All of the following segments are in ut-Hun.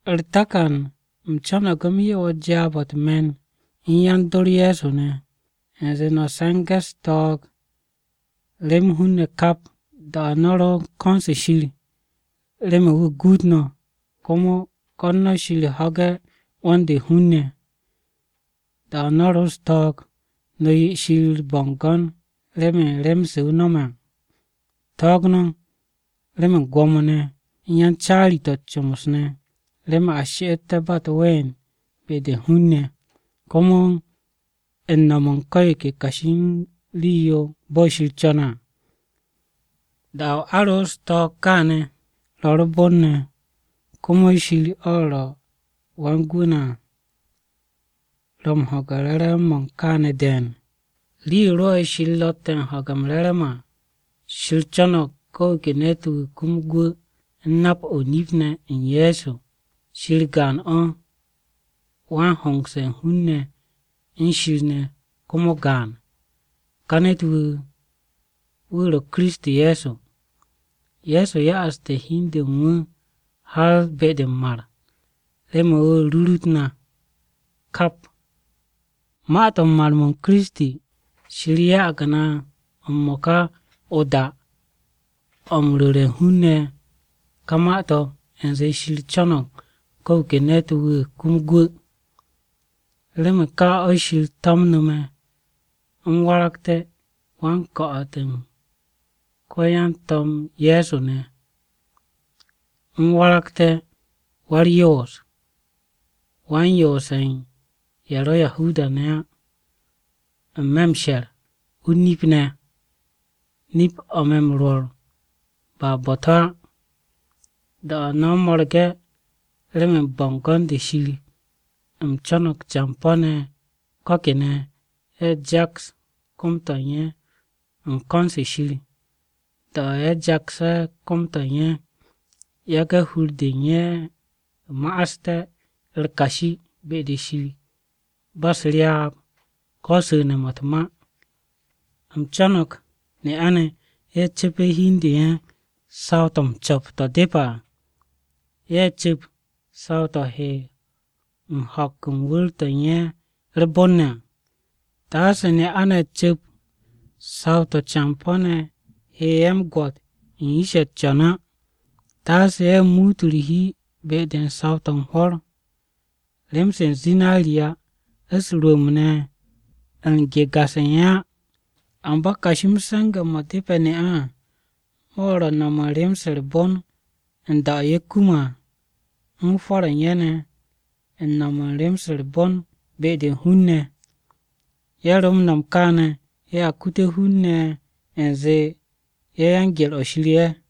U̱r-takan, u̱m co̱no̱g u̱m 'ye wo̱ jaab-o̱ u̱t-me̱n u̱n yan-dor Ye̱so ne̱, u̱nze no̱ se̱nge̱ u̱s-ko̱n Shir remen hun-ne̱ kap. Da-o̱ no̱ ro u̱n ko̱n-se Shir remen wu̱ guut no̱, komo ko̱n no̱ Shir ho̱ge̱ 'wo̱n-de u̱n hun-ne̱. Da-o̱ no̱ ro u̱s-ko̱n Shir, no̱ 'ye Shir u̱r-bo̱ngo̱n remen rem-se wu̱ no̱me̱ à. Ko̱n no̱ Shir remen gwo̱mo-ne̱, u̱n yan-caari-to̱ u̱t-comos ne̱, remen a she'eté̱ ba u̱t-ween be-de u̱n hun-ne̱. Komo u̱n no̱m u̱n ko̱ yo ke kashi u̱n rii-yo bo̱ Shir co̱ne̱ à. Da-o̱ a ro u̱s-ko̱n kaane̱, ro̱ u̱r-bon ne̱, komo Shir, o̱ ro̱ Wan-Gwu̱ na à, ro̱ m-ho̱ge̱ re̱re̱m-mo̱ u̱n kaane̱ de̱e̱n. Rii-yo rwo̱'e̱ Shir ro̱tte̱ u̱n ho̱ge̱ m-re̱re̱m à, Shir co̱no̱g ko̱ wu̱ ke ne̱t-wu̱ kum gwu̱ u̱n nap-o̱ o-nip ne̱ u̱n Ye̱so. Shir gaan-o̱. Wan-hongse̱ u̱n hun-ne̱ u̱n Shir ne̱ komo gaan. Ka ne̱t-wu̱, wu̱ ro̱ Kiristi Ye̱so. Ye̱so ya'aste̱ hi u̱n de u̱n wu̱ har be-de m-mar, remen wu̱ rurut na kap. Ma-to̱ u̱n mar-m Kiristi, Shir ya'ag na m-mo̱ka o-da o̱ m-ru̱re̱ hun-ne̱ ka ma-to̱ u̱nze Shir co̱no̱g ko̱ wu̱ ke ne̱t-wu̱ kum gwu̱. Remen ka o̱ Shir to̱mnu̱ me̱ u̱m waragte̱ wa-o-ko̱'o̱t u̱n ko-yan-To̱m Ye̱so ne̱. U̱m waragte̱ Wa-u̱r-Yoos, wan-yoose̱ u̱n ye̱ ro̱ Yahuda-ne̱ á, n-me̱ m-she̱r, o-nip ne̱. Nip-o̱ me̱ m-rwo̱r ba bo̱-to̱ á. Da-o̱ no̱ mo̱rge̱ remen bo̱ngo̱n-de Shir, u̱m co̱no̱g campo̱-ne̱ ko̱ kene̱, ye̱ jaks kom-to̱ u̱n ye̱ u̱n ko̱n-se Shir. Da-o̱ ye̱ jakse̱ kom-to̱ u̱n ye̱, yage̱ hur-de u̱n ye̱ ma'aste̱ u̱r-kashi be-de Shir, ba u̱s-ryaab ko̱ su̱ne̱-mo̱ u̱t-ma. U̱m co̱no̱g ne'a-ne̱ ye̱ cu̱pe̱ hi u̱n de u̱n ye̱ saw-to̱ m-co̱p to̱ depe̱ à. Ye̱ cu̱p saw-to̱ he u̱n ho̱k u̱n wu̱r-to̱ u̱n ye̱ u̱r-bon ne̱ à. Taase ne'a-ne̱ cu̱p saw-to̱ campo̱-ne̱ hette̱ ye̱ m-gwo̱t u̱n yish-ye̱ o-yoor á. Taase ye̱ muut u̱r-hi be-de u̱n saw-to̱ u̱n hwo̱r, rem-se u̱n zinariya, u̱s-rwu̱u̱mb ne̱ u̱n ga-se u̱n ye̱ á. Amba kashi m-se̱nge̱ mo̱ depe̱ ne'a-ne̱ à, mo̱ ro̱ no̱m u̱n rem-se u̱r-bon u̱n da-o̱ ye̱ kume̱ à, u̱n hwo̱r-ye̱ u̱n ye̱ ne̱ u̱n no̱m u̱n rem-se u̱r-bon be-de u̱n hun-ne̱. Ye̱ ro m-no̱m kaane̱ ye̱a kute̱ hun-ne̱ u̱nze ye̱ yan-gye̱r-o̱ Shir ye̱.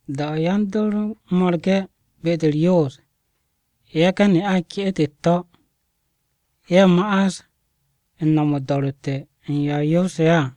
Da-o̱ yan-dor mo̱rge̱ be-de u̱r-yoos, yage̱ ne'a-ne̱ ke'et u̱t-to̱, ye̱ ma'as u̱n no̱m o-do̱ro̱tte̱ u̱n yo a yoose̱ ye̱ à.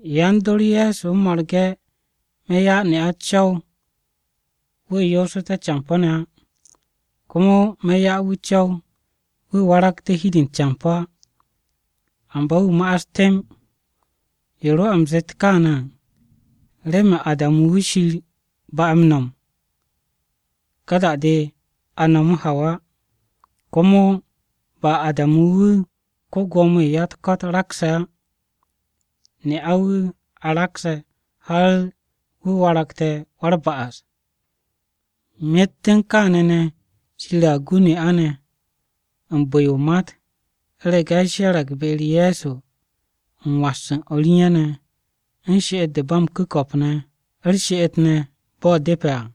Yan-dor Ye̱so mo̱rge̱, me̱ 'ya ne'a co̱w-yo wu̱ yoosu̱te̱ campo̱-ne̱ á. Komo me̱ 'ya wu̱ co̱w wu̱ waragte̱ hi-de u̱n campo̱ á, amba wu̱ ma'as temb. Yo rwo̱'e̱ u̱m zet kaane̱ à, remen Adamu wu̱ Shir ba'e̱ m-no̱m, ka da-de a no̱mu̱ Hawa. Komo ba Adamu wu̱ ko-Gwo̱mo-wu̱ u̱n ya-u̱t-ko̱t rakse̱ á, ne'a-wu̱ a rakse̱ har wu̱ waragte̱ wa-u̱r-ba'as. Myet u̱n kaane̱ ne̱, Shir a gu ne'a-ne̱ u̱n bu̱-yo u̱n o-mat, u̱rege̱ ye̱ she̱re̱g be-u̱r Ye̱so, u̱n was u̱n o̱r u̱n ye̱ ne̱ ne̱, u̱n she'et-de ba m-ku̱ko̱p ne̱, u̱r-she'et ne̱ bo̱ depe̱ à.